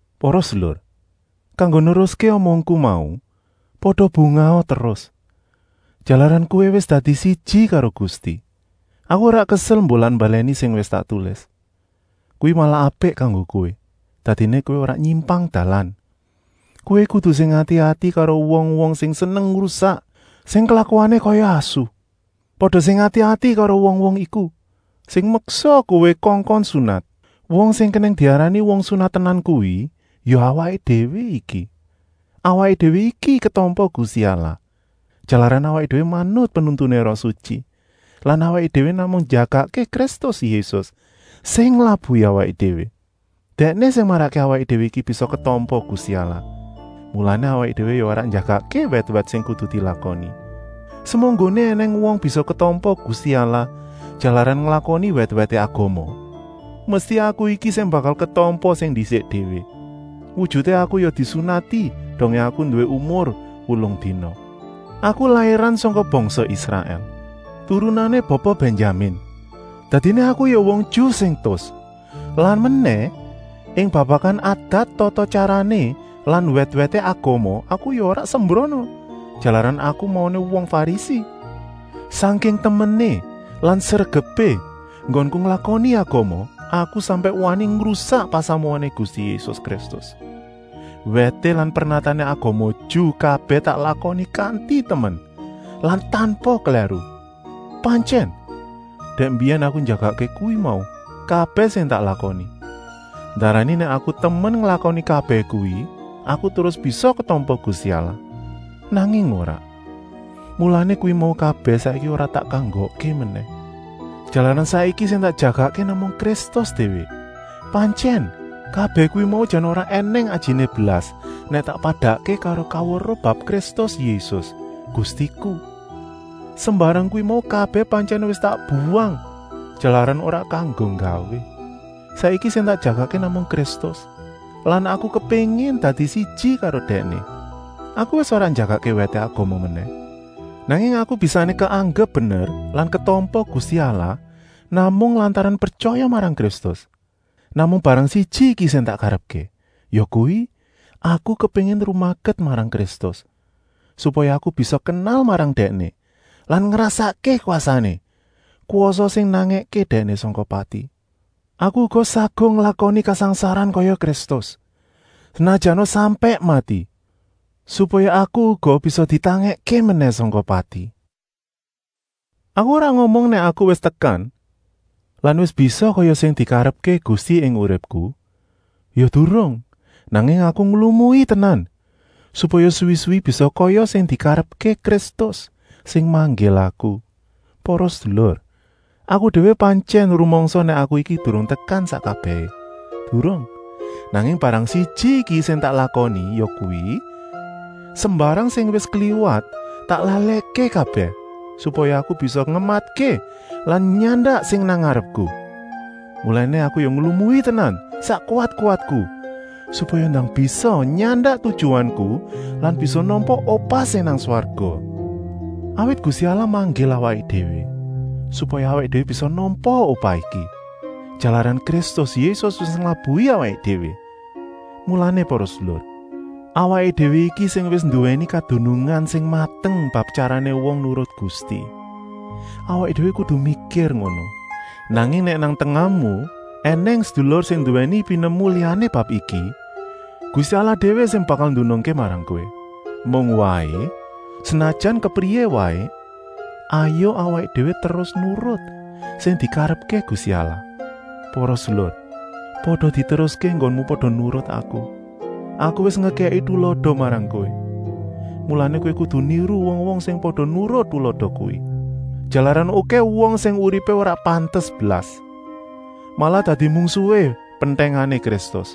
Para sedulur, kanggo neruské omongku mau, pada bungaha terus, jalaran kowé wis dadi siji karo Gusti. Aku ora kesel mbolan-mbalèni sing wis tak tulis. Kuwi malah apik kanggo kowé, dadiné kowé ora nyimpang dalan. Kowé kudu sing ati-ati karo wong-wong sing seneng ngrusak, sing klakuané kaya asu. Pada sing ati-ati karo wong-wong iku, sing meksa kowé kongkon sunat. Wong sing kenèng diarani wong sunat tenan kuwi ya awaké déwé iki. Awaké déwé iki ketampa Gusti Allah, jalaran awaké déwé manut penuntuné Roh Sutyi lan awaké déwé namung njagakké Kristus Yésus, sing nglabuhi awaké déwé. Dèkné sing marakké awaké déwé iki bisa ketampa Gusti Allah, mulané awaké déwé ya ora njagakké wèt-wèt sing kudu dilakoni. Semunggoné ènèng wong bisa ketampa Gusti Allah jalaran nglakoni wèt-wèté agama, mesti aku iki sing bakal ketampa sing ndisik déwé. Wujuté aku ya disunati dongé aku nduwé umur wolung dina. Aku lairan sangka bangsa Israèl, turunané Bapa Bènyamin. Dadiné aku ya wong Ju sing tus. Lan menèh, ing babakan adat-tata-tyarané lan wèt-wèté agama aku ya ora sembrana, jalaran aku mauné wong Farisi. Sangking temené lan sregepé enggonku nglakoni agama, aku sampèk wani ngrusak pasamuané Gusti Yésus Kristus. Wèté lan pernatané agama Ju kabèh tak lakoni kanti temen lan tanpa klèru. Pantyèn, dèk mbiyèn aku njagakké kuwi mau kabèh sing tak lakoni. Ndarani nèk aku temen nglakoni kabèh kuwi aku terus bisa ketampa Gusti Allah. Nanging ora, mulané kuwi mau kabèh saiki ora tak kanggokké menèh, jalaran saiki sing tak jagakké namung Kristus déwé. Pantyèn, kabèh kuwi mau jan ora ènèng ajiné blas nèk tak padakké karo kaweruh bab Kristus Yésus, Gustiku. Sembarang kuwi mau kabèh pantyèn wis tak buwang, jalaran ora kanggo gawé. Saiki sing tak jagakké namung Kristus lan aku kepéngin dadi siji karo Dèkné. Aku wis ora njagakké wèté agama menèh, nanging aku bisané keanggep bener lan ketampa Gusti Allah namung lantaran pretyaya marang Kristus. Namung barang siji iki sing tak karepké, yakuwi, aku kepéngin rumaket marang Kristus, supaya aku bisa kenal marang Dèkné lan ngrasakké kwasané, kwasa sing nangèké Dèkné sangka pati. Aku uga saguh nglakoni kasangsaran kaya Kristus, senajana sampèk mati, supaya aku uga bisa ditangèkké menèh sangka pati. Aku ora ngomong nèk aku wis tekan lan wis bisa kaya sing dikarepké Gusti ing uripku, ya durung, nanging aku nglumui tenan, supaya suwi-suwi bisa kaya sing dikarepké Kristus, sing manggil aku. Para sedulur, aku déwé pantyèn rumangsa nèk aku iki durung tekan sak kabèhé, durung, nanging barang siji iki sing tak lakoni, yakuwi: sembarang sing wis kliwat tak lalèkké kabèh, supaya aku bisa ngematké lan nyandak sing nang ngarepku. Mulané aku ya nglumui tenan sak kuwat-kuwatku, supaya ndang bisa nyandak tujuanku lan bisa nampa upah sing nang swarga. Awit Gusti Allah manggil awaké déwé supaya awaké déwé bisa nampa upah iki, jalaran Kristus Yésus wis nglabuhi awaké déwé. Mulané para sedulur, awaké déwé iki sing wis nduwèni kadunungan sing mateng bab tyarané wong nurut Gusti, awaké déwé kudu mikir ngono. Nanging nèk nang tengahmu ènèng sedulur sing nduwèni pinemu liyané bab iki, Gusti Allah déwé sing bakal ndunungké marang kowé. Mung waé, senajan kepriyé waé, hayuk awaké déwé terus nurut sing dikarepké Gusti Allah. Para sedulur, pada diteruské enggonmu pada nurut aku. Aku wis ngekèki tulada marang kowé, mulané kowé kudu niru wong-wong sing pada nurut tulada kuwi. Jalaran okèh wong sing uripé ora pantes blas, malah dadi mungsuhé pentèngané Kristus.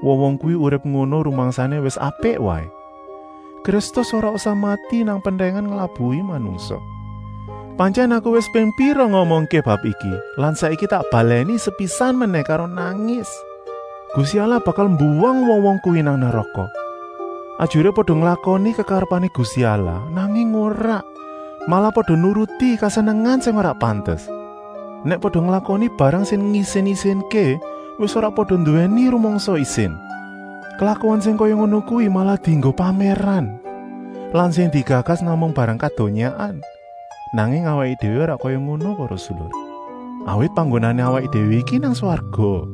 Wong-wong kuwi urip ngono rumangsané wis apik waé, Kristus ora usah mati nang pentèngan nglabuhi manungsa. Pantyèn aku wis ping pira ngomongké bab iki lan saiki tak balèni sepisan menèh karo nangis: Gusti Allah bakal mbuwang wong-wong kuwi nang neraka. Ajuré pada nglakoni kekarepané Gusti Allah, nanging ora, malah pada nuruti kesenengan sing ora pantes. Nèk pada nglakoni barang sing ngisin-isinké wis ora pada nduwèni rumangsa isin; klakuan sing kaya ngono kuwi malah dienggo pamèran lan sing digagas namung barang kadonyaan. Nanging awaké déwé ora kaya ngono para sedulur, awit panggonané awaké déwé iki nang swarga.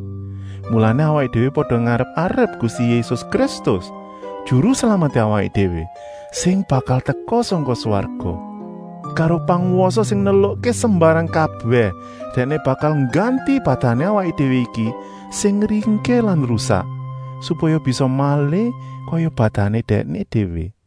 Mulané awaké déwé pada ngarep-arep Gusti Yésus Kristus, Juru Slameté awaké déwé, sing bakal teka sangka swarga. Karo pangwasa sing nelukké sembarang kabèh Dèkné bakal ngganti badané awaké déwé iki sing ringkih lan rusak, supaya bisa malih kaya badané Dèkné déwé.